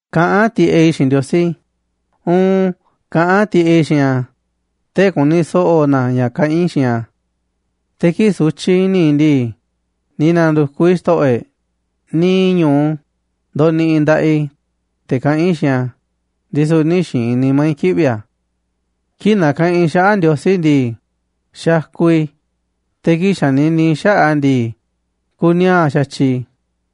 Kaꞌán tiꞌeꞌ i̱ xiinꞌ Ndiosí, uun, kaꞌán tiꞌeꞌ i̱ xiinꞌ a̱, tee̱ꞌ ku̱ni̱ so̱ꞌo̱ na a̱ ña̱ kaꞌán i̱ xiinꞌ a̱. Te̱ kii̱ꞌ sutyiꞌ i̱ni̱ i̱ ndii, ni̱ na̱ndu̱kuꞌ i̱ Xto̱ꞌo̱ e̱ꞌ, niiꞌ ñu̱u ndoniꞌiꞌ i̱ nda̱ꞌaꞌ i̱, te̱ kaꞌán i̱ xiinꞌ a̱, ndisu̱ nï̱ xi̱i̱n nimá i̱ kiꞌvi̱ a̱. Kii̱ꞌ nakaꞌanꞌ i̱ xaꞌa̱ꞌ Ndiosí ndii, xakuꞌ i̱, te̱ kii̱ꞌ xanini i̱ xaꞌa̱ꞌ a̱ ndii, kuniaa̱ꞌ xa̱tyiꞌ i̱.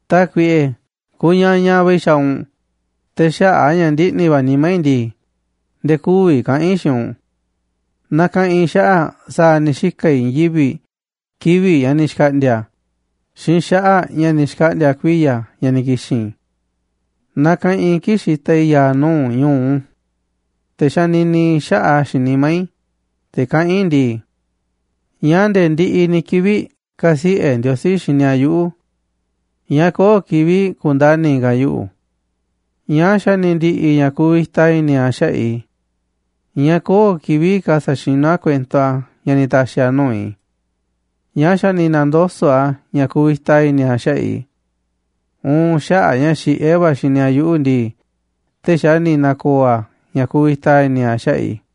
Tákuiꞌe, kuñañaꞌ va̱ i̱ xa̱a̱ u̱nꞌ, te̱ xaꞌa̱ꞌ a̱ ña̱ ndiꞌni̱ va̱ nimá i̱ ndii, nde̱e̱ kü̱vi̱ kaꞌa̱n i̱ xiinꞌ u̱nꞌ. Nakaꞌanꞌ i̱ xaꞌa̱ꞌ sa̱a̱ ni̱ xika̱ i̱ i̱i̱n yivi̱ꞌ kivi̱ꞌ ña̱ ni̱ xkaꞌndi̱a̱ xiinꞌ xaꞌa̱ꞌ ña̱ ni̱ xkaꞌndi̱a̱ kuiya̱ ña̱ ni̱ ki̱xi̱n. Nakaꞌanꞌ i̱ kii̱ꞌ xitaꞌ i̱ ya̱a̱ nuu̱ꞌ u̱nꞌ ñu̱u. Te̱ xanini i̱ xaꞌa̱ꞌ a̱ xiinꞌ nimá i̱, te̱ kaꞌán i̱ ndii: “¿Ñáá nde̱e̱ ndiꞌiꞌ ni̱ kivi̱ꞌ ka̱siꞌe̱ Ndiosí xini a̱ yuꞌu̱? ¿Ñáá köo̱ꞌ kivi̱ꞌ ku̱ndani̱ ka̱ a̱ yuꞌu̱? ¿Ñáá xa̱ ni̱ ndi̱ꞌi̱ ña̱ kuvita i̱ni̱ a̱ xaꞌa̱ꞌ i̱? ¿Ñáá köo̱ꞌ kivi̱ꞌ ka̱ sa̱xinú a̱ kuento a̱ ña̱ ni̱ ta̱xi̱ a̱ nuu̱ꞌ i̱? ¿Ñáá xa̱ ni̱ na̱ndoso̱ꞌ a̱ ña̱ kuvita i̱ni̱ a̱ xaꞌa̱ꞌ i̱? Uun xaꞌa̱ꞌ a̱ ña̱ xiꞌé va̱ a̱ xini a̱ yuꞌu̱ ndii, tee̱ꞌ xa̱ ni̱ na̱ko̱o̱ a̱ ña̱ kuvita i̱ni̱ a̱ xaꞌa̱ꞌ i̱.”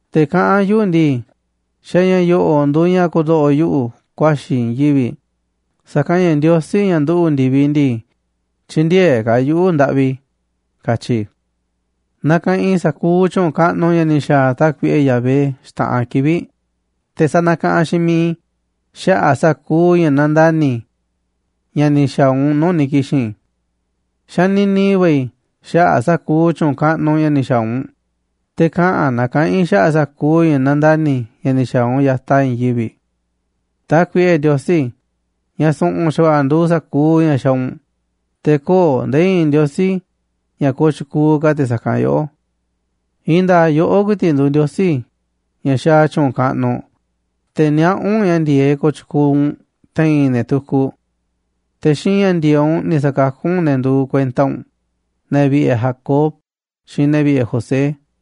Te̱ kaꞌán yuꞌu̱ ndii: “Xa̱ ña̱ yo̱ꞌo̱ꞌ nduuꞌ ña̱ ku̱ndo̱ꞌo̱ yuꞌu̱ ku̱a̱xi̱ i̱ i̱i̱n yivi̱ꞌ, sa̱kanꞌ ña̱ Ndiosí, ña̱ nduꞌu̱ꞌ ndi̱viꞌ ndii, tyï̱ndi̱e̱eꞌ ka̱ a̱ yuꞌu̱, ndaꞌvi”, katyi i̱. Nakaꞌanꞌ i̱ sa̱kuuꞌ tyu̱u̱n kaꞌnuꞌ ña̱ ni̱ xa̱a̱ Tákuiꞌe Yahvé xta̱ꞌanꞌ kivi̱ꞌ, te̱ sa̱na̱kaꞌanꞌ xiinꞌ mi̱iꞌ i̱ xaꞌa̱ꞌ sa̱kuuꞌ ña̱ nandani̱ ña̱ ni̱ xa̱a̱ u̱nꞌ nuu̱ꞌ ni̱ ki̱xi̱n. Xanini va̱ i̱ xaꞌa̱ꞌ sa̱kuuꞌ tyu̱u̱n kaꞌnuꞌ ña̱ ni̱ xa̱a̱ u̱nꞌ, te̱ kaꞌa̱n na kaꞌa̱n i̱ xaꞌa̱ꞌ sa̱kuuꞌ ña̱ nandani̱ ña̱ ni̱ xa̱a̱ u̱nꞌ ya̱taꞌ i̱i̱n yivi̱ꞌ. Tákuiꞌe Ndiosí, ña̱ su̱ꞌu̱n xa̱va̱ꞌa̱ nduuꞌ sa̱kuuꞌ ña̱ xaaꞌ u̱nꞌ, te̱ köo̱ꞌ nde̱e̱ i̱i̱n ndiosí ña̱ kooꞌ tyukuuꞌ ka̱ te̱ sa̱kanꞌ yoꞌó. I̱i̱n nda̱a̱ꞌ yoꞌó ku̱i̱ti̱ꞌ nduuꞌ Ndiosí ña̱ xaaꞌ tyu̱u̱n kaꞌnuꞌ, te̱ niaꞌá u̱nꞌ ña̱ ndi̱e̱eꞌ kooꞌ tyukuuꞌ u̱nꞌ te̱i̱n ne̱ tukuꞌ. Te̱ xiinꞌ ña̱ ndi̱e̱eꞌ u̱nꞌ ni̱ sa̱kakú u̱nꞌ ne̱ nduuꞌ kuenta u̱nꞌ, ne̱ vi̱ꞌe̱ Jacob xiinꞌ ne̱ vi̱ꞌe̱ José.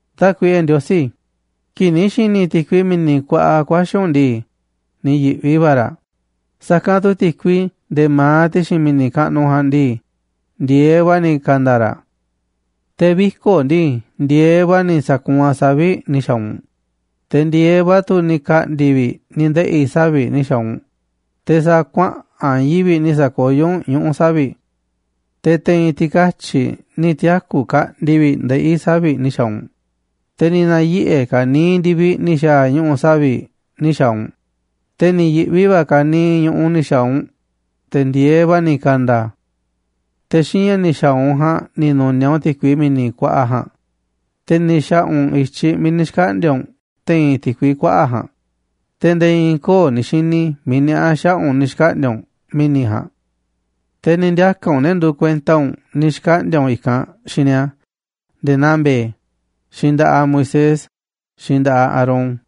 Tákuiꞌe Ndiosí, kii̱ꞌ ni̱ xi̱ni̱ ti̱kui mi̱ni̱ kuaꞌa ku̱a̱xi̱ u̱nꞌ ndii, ni̱ yi̱ꞌvi va̱ raꞌ, sa̱kanꞌ tu̱ ti̱kui nde̱e̱ ma̱aꞌ ti̱xi̱n mi̱ni̱ kaꞌnuꞌ ja̱a̱nꞌ ndii, ndi̱e̱eꞌ va̱ ni̱ ka̱nda̱ raꞌ. Te̱ viko̱ꞌ ndii, ndi̱e̱eꞌ va̱ ni̱ sa̱kuunꞌ a̱ savi̱ꞌ ni̱ xa̱a̱ u̱nꞌ, te̱ ndi̱e̱eꞌ va̱ tu̱ ni̱ ka̱ꞌndi̱ vi̱ꞌ ni̱ ndeꞌi̱ savi̱ꞌ ni̱ xa̱a̱ u̱nꞌ, te̱ sa̱a̱ kuaꞌa̱n i̱i̱n yivi̱ꞌ ni̱ sa̱koyó u̱nꞌ ñuꞌu̱ savi̱ꞌ. Te̱ te̱i̱n ti̱katyi̱ꞌ ni̱ tiaku̱ kaꞌndi vi̱ꞌ ndeꞌí savi̱ꞌ ni̱ xa̱a̱ u̱nꞌ, te̱ ni̱ na̱yiꞌe̱ ka̱niiꞌ ndi̱viꞌ ni̱ xa̱a̱ ñuꞌu̱ savi̱ꞌ ni̱ xa̱a̱ u̱nꞌ, te̱ ni̱ yi̱ꞌvi va̱ ka̱niiꞌ ñu̱ꞌuꞌ ni̱ xa̱a̱ u̱nꞌ, te̱ ndi̱e̱eꞌ va̱ ni̱ ka̱nda̱ a̱. Te̱ xiinꞌ ña̱ ni̱ xa̱a̱ u̱nꞌ ja̱a̱nꞌ ni̱ nu̱niaꞌ u̱nꞌ ti̱kui mi̱ni̱ kuaꞌa ja̱a̱nꞌ, te̱ ni̱ xa̱ꞌa̱ u̱nꞌ i̱tyiꞌ miiꞌ ni̱ xkaꞌndi̱a̱ u̱nꞌ te̱i̱n ti̱kui kuaꞌa̱ꞌ ja̱a̱nꞌ, te̱ nde̱e̱ i̱i̱n köo̱ꞌ ni̱ xini miiꞌ niaꞌá xaꞌa̱ꞌ u̱nꞌ ni̱ xkaꞌndi̱a̱ u̱nꞌ mi̱ni̱ ja̱a̱nꞌ. Te̱ ni̱ ndiaka̱ u̱nꞌ ne̱ nduuꞌ kuenta u̱nꞌ ni̱ xkaꞌndi̱a̱ u̱nꞌ i̱kanꞌ xiinꞌ ni̱a̱ nde̱e̱ naa mbe̱e̱, xiinꞌ nda̱ꞌaꞌ Moisés xiinꞌ nda̱ꞌaꞌ Aarón.